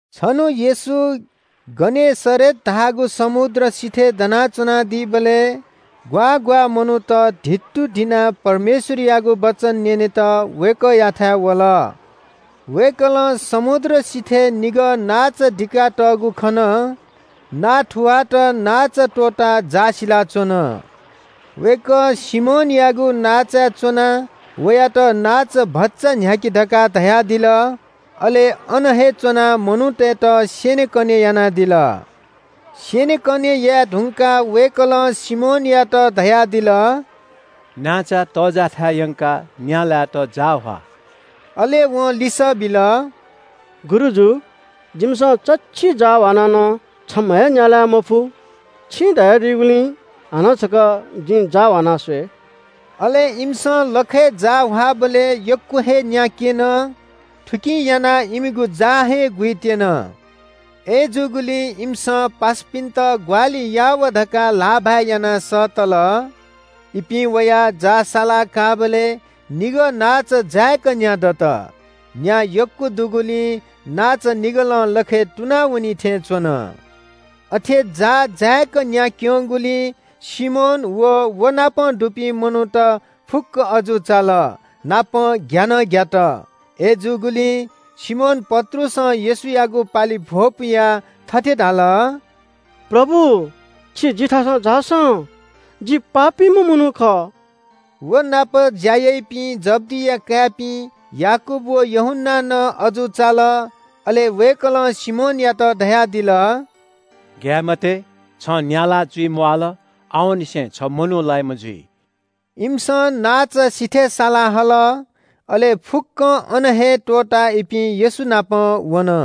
छन्‍हु येशू गनेसरेत धाःगु समुद्र सिथय् दना च्‍वनादीबलय् ग्‍वाः ग्‍वाः मनूत धित्तुधिनाः परमेश्‍वरयागु वचन न्‍यनेत वय्‌कःयाथाय् वल। वय्‌कलं समुद्र सिथय् निगः नांचा दिका तःगु खन। नांथुवाःत नांचा त्‍वःताः जाः सिलाच्‍वन। वय्‌कः सिमोनयागु नांचाय् च्‍वनाः वयात नांचा भचा न्‍ह्याकि धकाः धयादिल। अले अन हे च्‍वनाः मनूतय्‌त स्‍यनेकने यानादिल। स्‍यनेकने याये धुंकाः वय्‌कलं सिमोनयात धयादिल – “नांचा तःजाःथाय् यंकाः न्‍या लायेत जाः ह्वा।” अले वं लिसः बिल – “गुरुजु, जिमिसं चच्‍छि जाः ह्वानाः नं छम्‍ह हे न्‍या लाये मफु। छिं धयादीगुलिं हानं छकः जिं जाः ह्वाना स्‍वये।” अले इमिसं लखय् जाः ह्वाःबलय् यक्‍व हे न्‍या क्‍यन। थुकिं यानाः इमिगु जाः हे गुइत्‍यन। अय्‌जूगुलिं इमिसं पासापिन्‍त ग्‍वाहालि याः वा धकाः ल्‍हाःभाय् यानाः सःतल। इपिं वयाः जाः साला काःबलय् निगः नांचा जाय्‌क न्‍या दत। न्‍या यक्‍व दुगुलिं नांचा निगलं लखय् तुना वनी थें च्‍वन। अथे जाः जाय्‌क न्‍या क्‍यंगुलिं सिमोन अले व नाप दुपिं मनूत फुक्‍क अजू चाल, नापं ग्‍या नं ग्‍यात। अय्‌जूगुलिं सिमोन पत्रुसं येशूयागु पालिइ भ्‍वपुयाः थथे धाल – “प्रभु, छि जिथासं झासँ, जि पापीम्‍ह मनू खः।” व नाप ज्‍या याइपिं जब्‍दिया काय्‌पिं याकूब व यूहन्‍ना नं अजू चाल। अले वय्‌कलं सिमोनयात धयादिल – “ग्‍याये मते, छं न्‍या लाः जुइ म्‍वाल, आवंनिसें छ मनू लाइम्‍ह जुइ।” इमिसं नांचा सिथय् सालाहल। अले फुक्‍कं अन हे त्‍वःताः इपिं येशू नाप वन।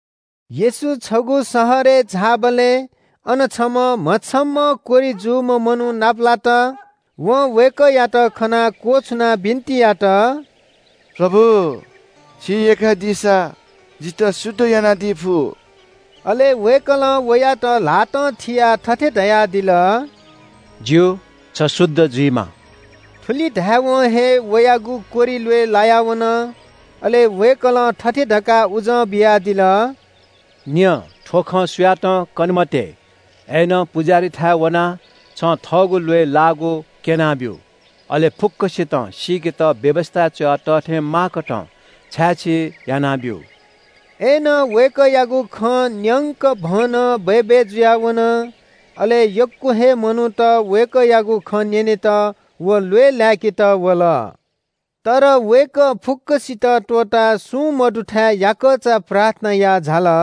येशू छगू शहरय् झाःबलय् अन छम्‍ह म्‍हछम्‍हं कोह्रि जूम्‍ह मनू नापलात। वं वय्‌कःयात खनाः क्‍वछुनाः बिन्‍ति यात – “प्रभु, छिं यय्‌कादीसा जितः शुद्ध यानादी फु।” अले वय्‌कलं वयात ल्‍हातं थियाः थथे धयादिल – “ज्‍यू, छ शुद्ध जुइमा।” थुलि धायेवं हे वयागु कोह्रि ल्‍वय् लाया वन। अले वय्‌कलं थथे धकाः उजं बियादिल – “न्‍यँ, थ्‍व खँ सुयातं कने मते। अय्‌नं पुजाहारीयाथाय् वनाः छिं थःगु ल्‍वय् लाःगु क्‍यनाब्‍यु। अले फुक्‍कसितं सीकेत व्‍यवस्‍थाय् च्‍वया तः थें माःकथं छाय्‌छी यानाब्‍यु।” अय्‌नं वय्‌कःयागु खँ न्‍यंकभनं बय्‌बय् जुयाः वन। अले यक्‍व हे मनूत वय्‌कःयागु खँ न्‍यनेत व ल्‍वय् लाय्‌केत वल। तर वय्‌कः फुक्‍कसित त्‍वःताः सुं मदुथाय् याकःचा प्रार्थना याः झाल।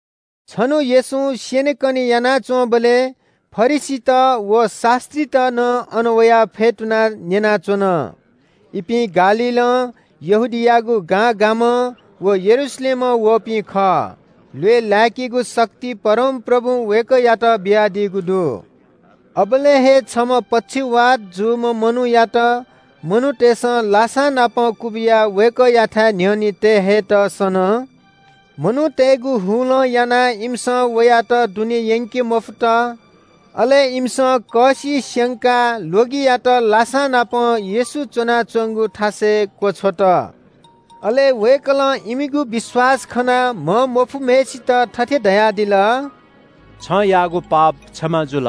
छन्‍हु येशूं स्‍यनेकने यानाच्‍वंबलय् फरिसीत व शास्‍त्रीत नं अन वयाः फ्‍यतुनाः न्‍यनाच्‍वन। इपिं गालीलं, यहूदियायागु गां गामं व यरूशलेमं वःपिं खः। ल्‍वय् लाय्‌केगु शक्ति परमप्रभुं वय्‌कःयात बियादीगु दु। अबलय् हे छम्‍ह पक्षवात जूम्‍ह मनूयात मनूतय्‌सं लासां नाप क्‍वबिया वय्‌कःयाथाय् न्‍ह्यःने तये हयेत सन। मनूतय्‌गु हुलं यानाः इमिसं वयात दुने यंके मफुत। अले इमिसं कःसि स्‍यंकाः ल्‍वगियात लासांनापं येशू च्‍वनाच्‍वंगु थासय् क्‍वछ्वत। अले वय्‌कलं इमिगु विश्‍वास खनाः म्‍हमफुम्‍हय्‌सित थथे धयादिल – “छं यानादीगु पाप क्षमा जुल।”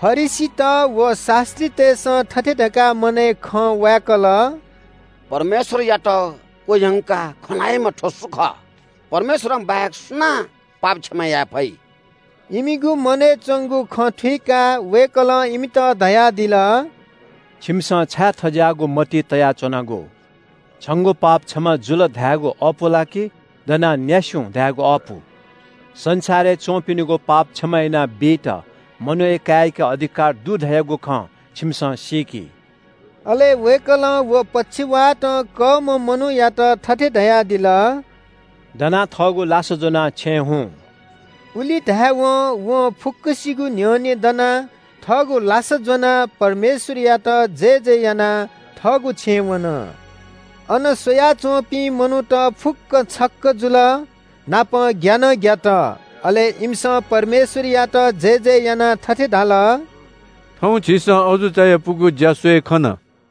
फरिसीत व शास्‍त्रीतय्‌सं थथे धकाः मनय् खँ वाय्‌कल – “परमेश्‍वरयात क्‍वह्यंकाः खँ ल्‍हाइम्‍ह थ्‍व सु खः? परमेश्‍वरं बाहेक सुनां पाप क्षमा याये फइ?” इमिगु मनय् च्‍वंगु खँ थुइकाः वय्‌कलं इमित धयादिल – “छिकपिन्‍सं छाय् थज्‍याःगु मतिइ तयाच्‍वनागु? ‘छंगु पाप क्षमा जुल’ धायेगु अःपु ला कि ‘दनाः न्‍यासि हुँ’ धायेगु अःपु? संसारय् च्‍वंपिनिगु पाप क्षमा यानाबीत मनूया काय्‌याके अधिकार दु धयागु खँ छिकपिन्‍सं सीकि।” अले वय्‌कलं व पक्षवातं कःम्‍ह मनूयात थथे धयादिल – “दनाः थःगु लासा ज्‍वनाः छेँ हुँ।” उलि धायेवं वं फुक्‍कसिगु न्‍ह्यःने दनाः थःगु लासा ज्‍वनाः परमेश्‍वरयात जयजय यानाः थःगु छेँ वन। अन स्‍वयाच्‍वंपिं मनूत फुक्‍क छक्‍क जुल, नापं ग्‍या नं ग्‍यात। अले इमिसं परमेश्‍वरयात जयजय यानाः थथे धाल – “थौं झीसं अजू चायापुगु ज्‍या स्‍वये खन।”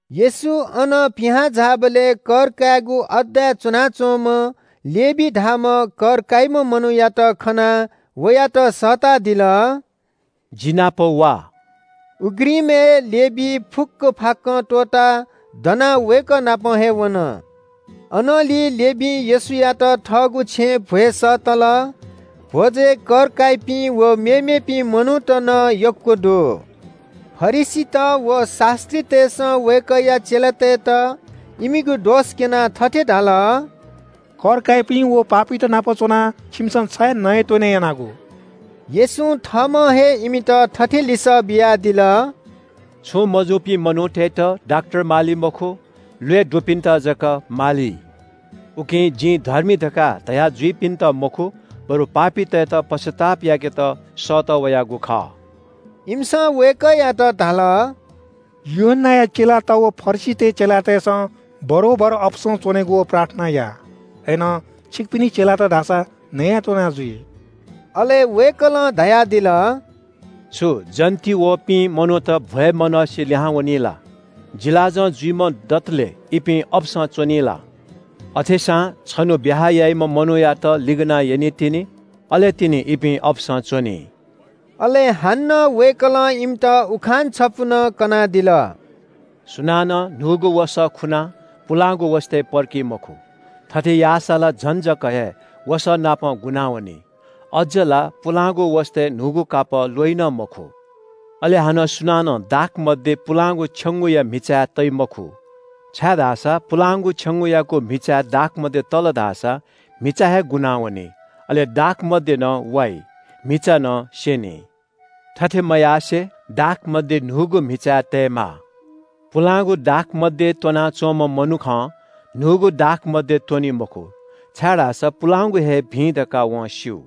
येशू अनं पिहां झाःबलय् कर कायेगु अड्डाय् च्‍वनाच्‍वंम्‍ह लेवी धाःम्‍ह कर काइम्‍ह मनूयात खनाः वयात सःतादिल – “जि नाप वा।” उघ्रिमय् लेवी फुक्‍क फाक्‍कं त्‍वःताः दनाः वय्‌कः नाप वन। अनंलि लेवीं येशूयात थःगु छेँय् भ्‍वय् सःतल। भ्‍वजय् कर काइपिं व मेमेपिं मनूत नं यक्‍व दु। फरिसीत व शास्‍त्रीतय्‌सं वय्‌कःया चेलातय्‌त इमिगु दोष क्‍यनाः थथे धाल – “कर काइपिं व पापीत नाप च्‍वनाः छिमिसं छाय् नयेत्‍वने यानागु?” येशूं थःम्‍हं हे इमित थथे लिसः बियादिल – “छुं मजूपिं मनूतय्‌त डाक्‍टर माली मखु, ल्‍वय् दुपिन्‍त जक माली। उकिं ‘जिं धर्मी’ धकाः धया जुइपिन्‍त मखु, बरु पापीतय्‌त पश्‍चाताप याकेत सःतः वयागु खः।” इमिसं वय्‌कःयात धाल – “यूहन्‍नाया चेलात व फरिसीतय् चेलातय्‌सं बरोबर अपसं च्‍वनेगु व प्रार्थना याः। अय्‌नं छिकपिनि चेलात धाःसा नया त्‍वनाजुइ।” अले वय्‌कलं धयादिल “छु जन्‍त वःपिं मनूत भ्‍वय् मनसे लिहांवनी ला? जिलाजं जुइम्‍ह दतले इपिं अपसं च्‍वनी ला? अथेसां छन्‍हु ब्‍याहा याइम्‍ह मनूयात लिगनाः यनीतिनि। अले तिनि इपिं अपसं च्‍वनी।” अले हानं वय्‌कलं इमित उखान छपु नं कनादिल। “सुनानं न्‍हूगु वसः खुनाः पुलांगु वसतय् पर्की मखु। थथे याःसा ला झन जक हे वसःनापं गुनावनी, अज्‍ज ला पुलांगु वसतय् न्‍हूगु कापः ल्‍वइ नं मखु। “अले हानं सुनानं दाखमद्य पुलांगु छेंगूया म्‍हिचाय् तइ मखु, छाय्‌धाःसा पुलांगु छेंगूयागु म्‍हिचाय् दाखमद्य तल धाःसा म्‍हिचा हे गुनावनी, अले दाखमद्य नं वाइ, म्‍हिचा नं स्‍यनी। थथे मयासें, दाखमद्य न्‍हूगु म्‍हिचाय् तयेमाः। पुलांगु दाखमद्य त्‍वना च्‍वंम्‍ह मनुखं न्‍हूगु दाखमद्य त्‍वनी मखु, छाय्‌धाःसा पुलांगु हे भिं धकाः वं स्‍यू।”